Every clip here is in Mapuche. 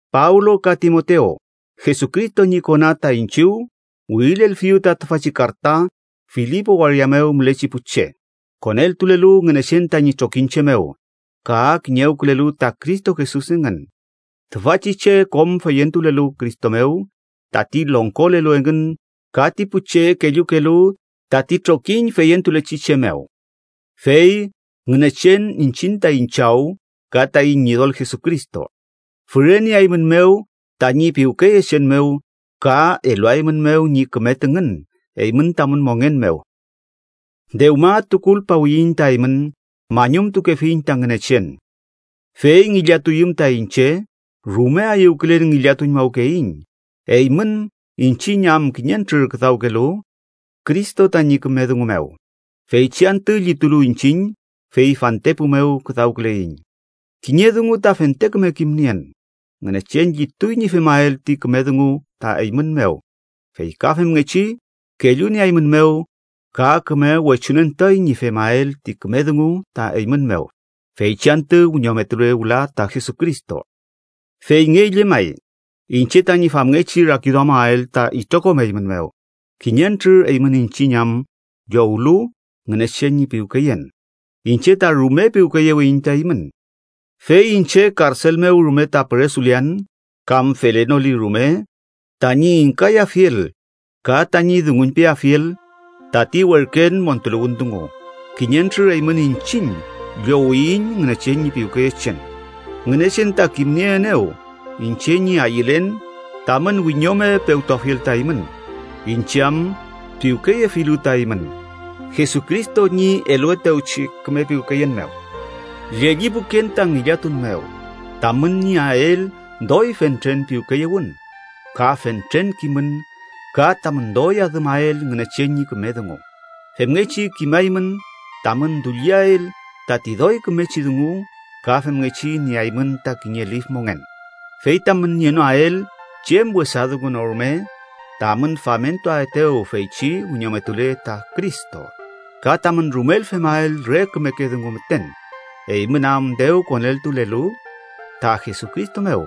Pablo ka Timotew, Jesucristo ñi kona ta iñchiw wirilelfiyu ta tüfachi karta Filipo waria mew mülechi pu che, koneltulelu Ngünechen tañi trokiñche mew, ka kiñewkülelu ta Cristo Jesus engün, tüfachi che kom feyentulelu Cristo mew tati longkolelu engün ka ti pu che kellukelu tati trokiñ feyentulechi che mew. Fey Ngünechen iñchiñ taiñ Chaw ka taiñ Ñidol Jesucristo füreneaeymünmew tañi piwkeyechen mew ka eluaeymünmew ñi küme tüngün eymün tamün mongen mew. Dewma tukulpawiyiñ ta eymün, mañumtukefiñ ta Ngünechen. Fey ngillatuyüm ta iñche, rume ayüwkülen ngillatuñmawkeyiñ eymün iñchiñ am kiñentrür küdawkelu Cristo tañi küme dungu mew, feychi antü llitulu iñchiñ fey fantepu mew küdawküleiñ. Kiñe dungu ta fente küme kimnien: Ngünechen llituy ñi femael ti küme dungu ta eymün mew, fey ka femngechi kellunieaeymünmew ka küme wechunentuay ñi femael ti küme dungu ta eymün mew, feychi antü wiñometule wüla ta Jesucristo. Feyngey llemay iñche tañi famngechi rakiduamael ta itrokom eymün mew, kiñentrür eymün iñchiñ am llowlu Ngünechen ñi piwkeyen, iñche ta rume piwkeyewiyiñ ta eymün. Fey iñche karsel mew rume ta püresulean kam felenoli rume tañi ingkayafiel ka tañi dunguñpeafiel tati werken montuluwün dungu, kiñentrür eymün iñchiñ llowiyiñ Ngünechen ñi piwkeyechen. Ngünechen ta kimnieenew iñche ñi ayülen tamün wiñome pewtuafiel ta eymün, iñche am piwkeyefilu ta eymün Jesucristo ñi eluetewchi küme piwkeyen mew. Llellipuken ta ngillatun mew tamün nieael doy fentren piwkeyewün, ka fentren kimün ka tamün doy adümael Ngünechen ñi küme dungu. Femngechi kimaymün tamün dulliael tati doy kümechi dungu ka femngechi nieaymün ta kiñe lif mongen, fey tamün nienoael chem wesa dungu no rume tamün famentuaetew feychi wiñometule ta Cristo. Ka tamün rumel femael re kümeke dungu müten, eymün am dew koneltulelu ta Jesucristo mew,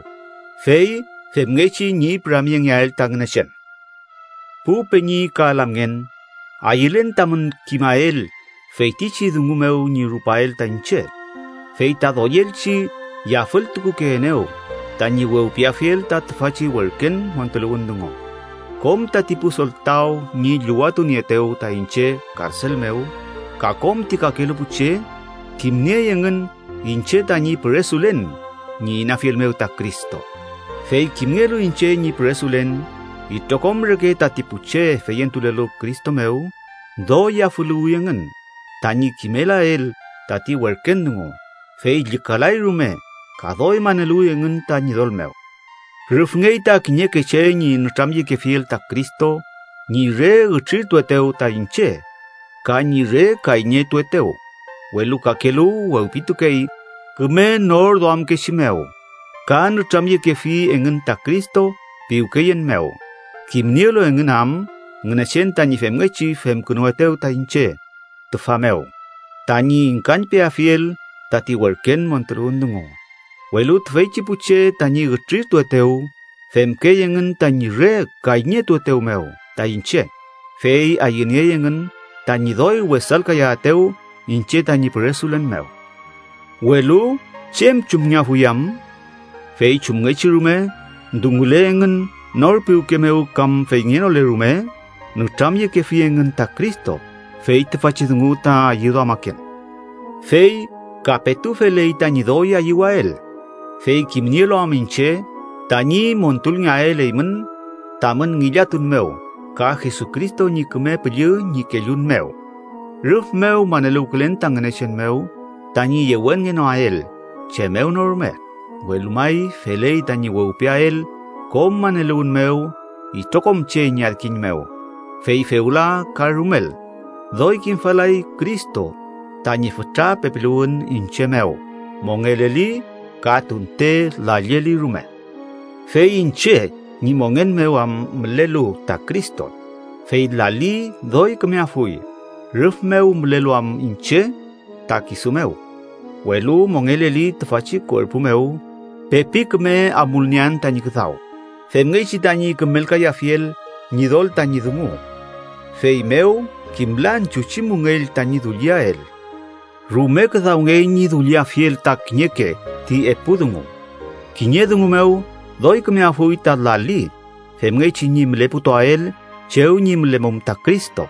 fey femngechi ñi püramyengeael ta Ngünechen. Pu peñi ka lamngen, ayülen tamün kimael feytichi dungu mew ñi rupael ta iñche, fey ta doyelchi yafültukukeenew tañi wewpiafiel ta tüfachi werken montuluwün dungu. Kom tati pu soltaw ñi llüwatunieetew ta iñche karsel mew, ka kom ti kakelu pu che, kimniey engün iñche tañi püresulen ñi inafiel mew ta Cristo. Fey kimngelu iñche ñi püresulen, itrokom reke tati pu che feyentulelu Cristo mew doy yafüluwi engün tañi kimelael tati werken dungu, fey llükalay rume ka doy maneluwi engün ta Ñidol mew. Rüfngey ta kiñeke che ñi nütramyekefiel ta Cristo ñi re ütrirtuetew ta iñche ka ñi re kayñetuetew, welu kakelu wewpitukey küme nor duamkechi mew ka nütramyekefi engün ta Cristo piwkeyen mew, kimnielu engün am Ngünechen tañi femngechi femkünuetew ta iñche tüfa mew tañi ingkañpeafiel tati werken montuluwün dungu. Welu tüfeychi pu che tañi ütrirtuetew, femkey engün tañi re kayñetuetew mew ta iñche, fey ayüniey engün tañi doy wesalkayaetew iñche tañi püresulen mew. Welu ¿chem chumngeafuy am? Fey chumngechi rume, dungule engün nor piwke mew kam feyngenole rume, nütramyekefi engün ta Cristo. Fey tüfachi dungu ta ayüduamaken. Fey ka petu feley tañi doy ayüwael, fey kimnielu am iñche tañi montulngeael eymün tamün ngillatun mew ka Jesucristo ñi Küme Püllü ñi kellun mew. Rüf mew maneluwkülen ta Ngünechen mew tañi yewenngenoael chem mew no rume, welu may feley tañi wewpiael kom maneluwün mew itrokom che ñi adkiñ mew. Fey fewla ka rumel, doy kimfalay Cristo tañi fütra pepiluwün iñche mew, mongeleli ka tunte lalleli rume. Fey iñche ñi mongen mew am mülelu ta Cristo, fey lali doy kümeafuy rüf mew mülelu am iñche ta kisu mew. Welu mongeleli tüfachi kuerpu mew, pepi küme amulniean tañi küdaw, femngechi tañi kümelkayafiel Ñidol tañi dungu. Feymew kimlan chuchi müngell tañi dulliael. Rume küdawngey ñi dulliafiel ta kiñeke ti epu dungu: kiñe dungu mew, doy kümeafuy ta lali femngechi ñi müleputuael chew ñi mülemum ta Cristo,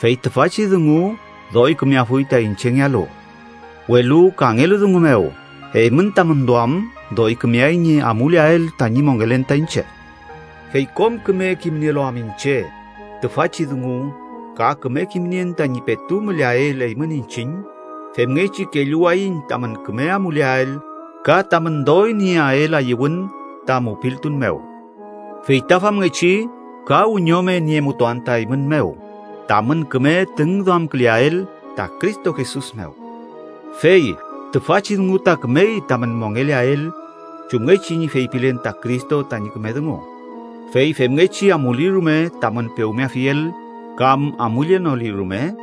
fey tüfachi dungu doy kümeafuy ta iñchengealu. Welu, kangelu dungu mew, eymün tamün duam doy kümeay ñi amuleael tañi mongelen ta iñche. Fey kom küme kimnielu am iñche tüfachi dungu ka küme kimnien tañi petu müleael eymün iñchiñ, femngechi kelluwayiñ tamün küme amuleael ka tamün doy nieael ayüwün ta mupiltun mew. Fey ta famngechi ka wiñome niemutuan ta eymün mew tamün küme tüngduamküleael ta Cristo Jesus mew. Fey tüfachi dungu ta kümey tamün mongeleael chumngechi ñi feypilen ta Cristo tañi küme dungu. Fey femngechi amuli rume tamün pewmeafiel kam amullenoli rume,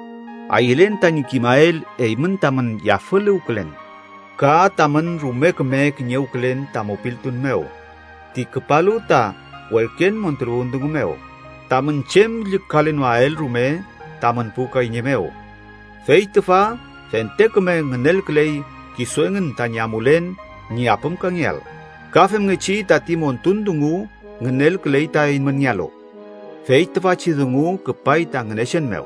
ayülen tañi kimael eymün tamün yafüluwkülen ka tamün rume küme kiñewkülen ta mupiltun mew ti küpalu ta werken montuluwün dungu mew, tamün chem llükalenoael rume tamün pu kayñe mew. Fey tüfa fente küme ngünelküley kisu engün tañi amulen ñi apümkangeael, ka femngechi tati montun dungu ngünelküley ta eymünngealu. Fey tüfachi dungu küpay ta Ngünechen mew.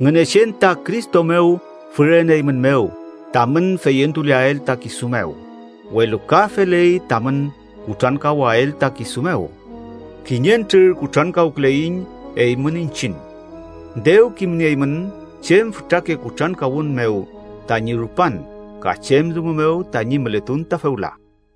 Ngünechen ta Cristo mew füreneeymünmew tamün feyentuleael ta kisu mew, welu ka feley tamün kutrankawael ta kisu mew. Kiñentrür kutrankawküleiñ eymün iñchiñ. Dew kimnieymün chem fütrake kutrankawün mew tañi rupan, ka chem dungu mew tañi mületun ta fewla.